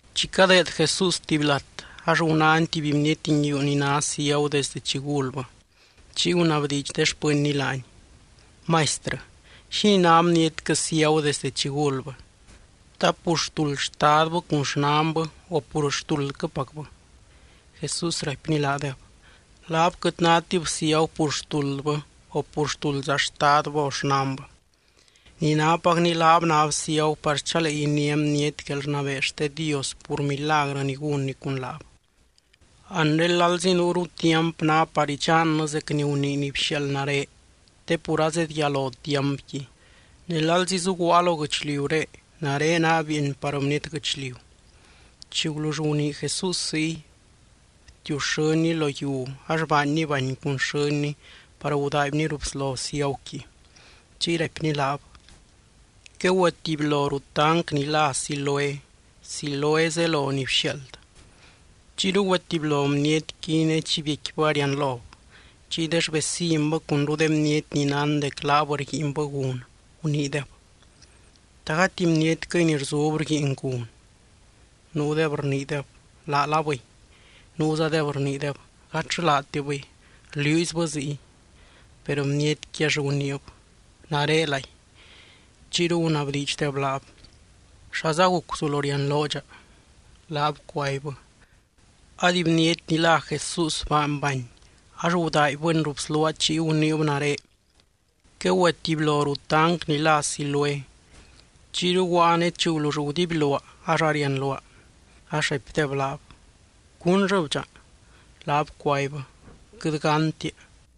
Chi cadeed Jesús tuby lat, ax gunány tuby bniety nguiu ni ná ciagu desdɨ chi gulbɨ. Chiy gunabdiidx de xpɨnny laany: —Maistrɨ, ¿xínii ná bnietquɨ ciagu desde chi gulbɨ? ¿Ta pur xtuld xtadbɨ cun xnanbɨ, o pur xtuldquɨpacbɨ? Jesús raipny laadeb: —Laab quɨt nátib ciagu pur xtuldbɨ, o pur xtuldza xtadbɨ o xnanbɨ. Ni nápacni, laab náb ciagu par chalee iniá bniety guelrnabee xte Dios pur milagrɨ ni gúnny cun laab. Anre lalzi nuuru tiamp ná par idxannɨ zec ni gunii ni bxiaald nare, te pur azedyalo tiampqui. Ne lalzi zuguaa lo guɨchliuré, nare naa bieeny par bniety guɨchliu. Chi gulull gunii Jesús ziy, btiuxɨ́nny lo yiu, ax baanny bany cun xɨ́nny par gudaaibny ruu bslo ciaguqui. Chiy raipny laab: —Quegüetibylo ruu tanc ni lá Siloé (Siloé zelo ni bxiaald). Chiyru güetibylo bnietqui, ne chi biecquibɨ arianlob. Chiy de xvecinbɨ cunru de bniety ni nán dec laab rguiinbɨ gun, guniideb: —¿Ta gati bnietquɨy ni rzub rguiin gun? Nuudeb rniideb: —Laalabɨy. Nuuzadeb rniideb: —Gatllɨ laatibɨy, rliuuzybɨ ziy. Per bnietqui ax guniib: —Narelay. Chiyru gunabdiidxdeb laab: —¿Xaza guc guzulo rianloo dxa? Laab cuaibbɨ: —Ady bniety ni lá Jesús baany bany ax gudaaibbɨni ruu bsluaa chiy guniib nare: “Quegüetibylo ruu tanc ni lá Siloé.” Chiyru guaa ne chi gulull gudibyluaa ax arianluaa. Ax raipdeb laab: —¿Cúnllɨb dxa? Laab cuaibbɨ: —Quɨt gántia.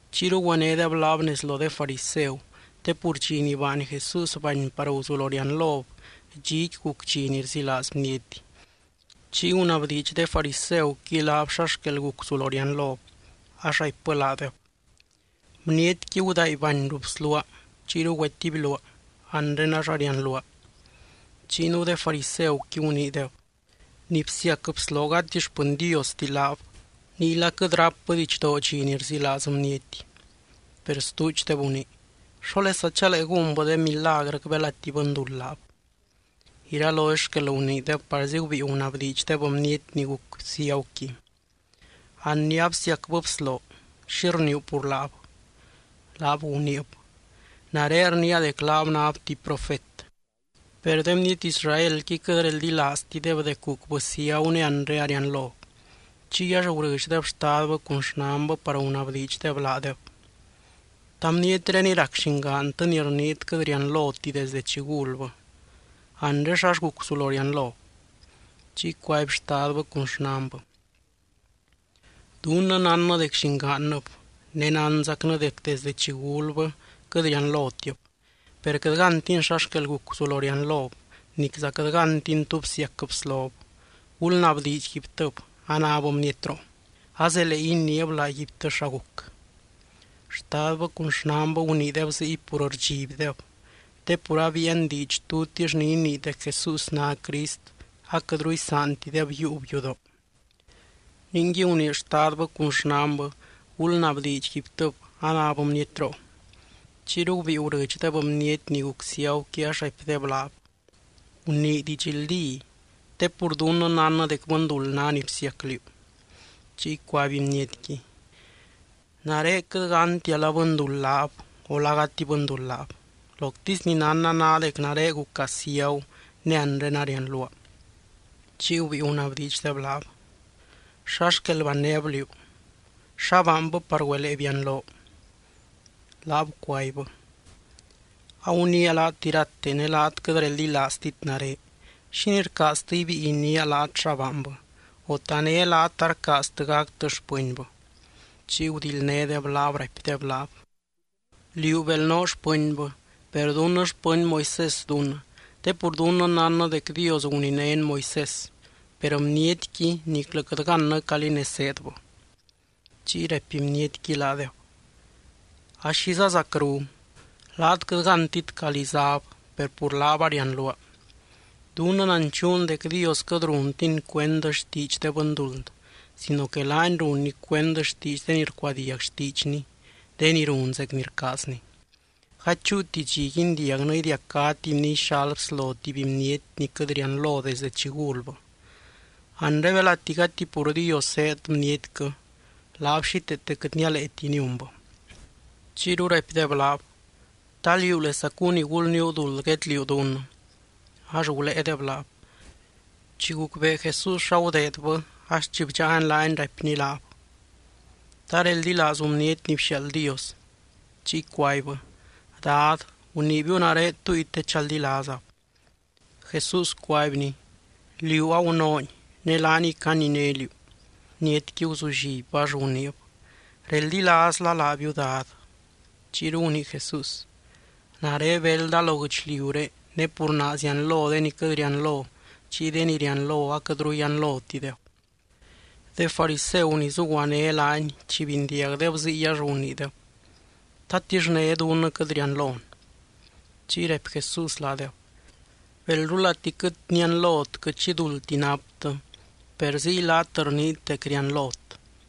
Chiyru güenédeb laab nez lo de fariseu te pur dxi ni baany Jesús bany par guzulo rianlob, dxiqui guc dxi ni rzilaaz bniety. Chiy gunabdiidx de fariseuqui laab xa xquel guc guzulo rianlob. Ax raipbɨ laadeb: —Bnietqui gudaaiby bany ruu bsluaa, chiyru güetibyluaa. Anre ax arianluaa. Chiy nuu de fariseuqui guniideb: —Ni bsiac bsloo gati xpɨny Diosti laab, niyla quɨt rápbɨ didxdoo dxi ni rzilaaz bniety. Per stuudxdeb gunii: —¿Xólesa chalee gúnbɨ de milagrɨc belati bɨnduld laab? Iralozy xquel guniideb parzi gubíi gunabdiidxdeb bniety ni guc ciaguqui: —An ni absiacbɨ bsloo, ¿xi rniiu pur laab? Laab guniib: —Nare rniia dec laab náb tuby profet. Per de bniety Israelqui quɨt reldilaaztideb dec gucbɨ ciagu ne anre arianlob. Chiy ax gurɨdxdeb xtadbɨ cun xnanbɨ par gunabdiidxdeb laadeb: —¿Ta bnietréniy rac llingaantɨ ni rniit quɨt rianloti desdɨ chi gulbɨ? Anre, ¿xall guc guzulo rianlob? Chiy cuaby xtadbɨ cun xnanbɨ: —Dunnɨ nánnɨ dec llingaannɨb ne nánzacnɨ dec desde chi gulbɨ quɨt rianlotib. Per quɨt gántin xa xquel guc guzulo rianlob, nicza quɨt gántin tú bsiac bslob. Gulnabdiidxguibtɨb anáb bnietroo. Azelee iniib laaguibtɨ xa guc. Xtadbɨ cun xnanbɨ guniideb ziy pur rdxibdeb, te pur abiian diidx tutix ni inii dec Jesús ná Crist, aquɨtru isaantideb yiiub yudoo. Ningui, gunii xtadbɨ cun xnanbɨ: “Gulnabdiidxguibtɨb anáb bnietroo.” Chiyru gubíi gurɨdxdeb bniety ni guc ciaguqui ax raipdeb laab: —Gunii didxldí. Te pur dunnɨ nánnɨ dec bɨnduld ná ni bsiac liú. Chiy cuaby bnietqui: —Nare quɨt gántia la bɨnduld laab o la gati bɨnduld laab. Loctisy ni nánna ná dec nare guca ciagu ne anre arianluaa. Chiy gubíi gunabdiidxdeb laab: —¿Xa xquel bannéb liú? ¿Xa baanbɨ par güelee bianloo? Laab cuaibbɨ: —Aguniia laat irate ne laat quɨt reldilaaztit nare. ¿Xínii rcaaztɨ ibíi iniia laat xa baanbɨ? O, ¿ta né laat arcaaztɨ gactɨ xpɨnbɨ? Chiyru gudildnédeb laab raipdeb laab: —Liú bel noo xpɨnbɨ, per dunnɨ xpɨny Moisés dunnɨ te pur dunnɨ nánnɨ dec Dios guninény Moisés. Per bnietqui niclɨ quɨt gannɨ calí nez zéedbɨ. Chiy raipy bnietqui laadeb: —¡Axiza zacru! Laat quɨt gántit calí záb, per pur laab arianluaa. Dunnɨ nanchuun dec Dios quɨt runtiny cuend xtiidx de bɨnduld sino que laany runny cuend xtiidx de ni rcuadiag xtiidxny, de ni run zec ni rcaazny. Gady chúuti dxi guindiagnɨ idiacá tuby ni ixal bslo tuby bniety ni quɨt rianlo desdɨ chi gulbɨ. Anre belati gati pur Dios zéed bnietquɨ, laab xíteete quɨt nialeeti niunbɨ. Chiyru raipdeb laab: —¿Ta liúlesacu ni gulníu duld guedliuu dunnɨ? Ax guléedeb laab. Chi gucbee Jesús xa gudeedbɨ ax chi bdxáany laab raipny laab: —¿Ta reldilaazu Bniety ni bxiaald Dios? Chiy cuaibbɨ: —Dad, guniibiu nare túngui te chaldilaazab. Jesús cuaibny: —Liú agunoony. Ne laaniy caniné liú. Bnietqui guzullibbɨ, ax guniib: —Reldilaazla laabiu, Dad. Chiyru gunii Jesús: —Nare belda lo guɨchliuré ne pur naa zianlo de ni quɨt rianlo, chiy de ni rianlo aquɨtru yianlotideb. De fariseu ni zuguané laany, chi bindiagdeb ziy ax guniideb: —¿Tatix né dunnɨ quɨt rianlon? Chiy raipy Jesús laadeb: —Belrulati quɨt nianlot quɨt xi duldti naptɨ, per ziy laat rniit dec rianlot.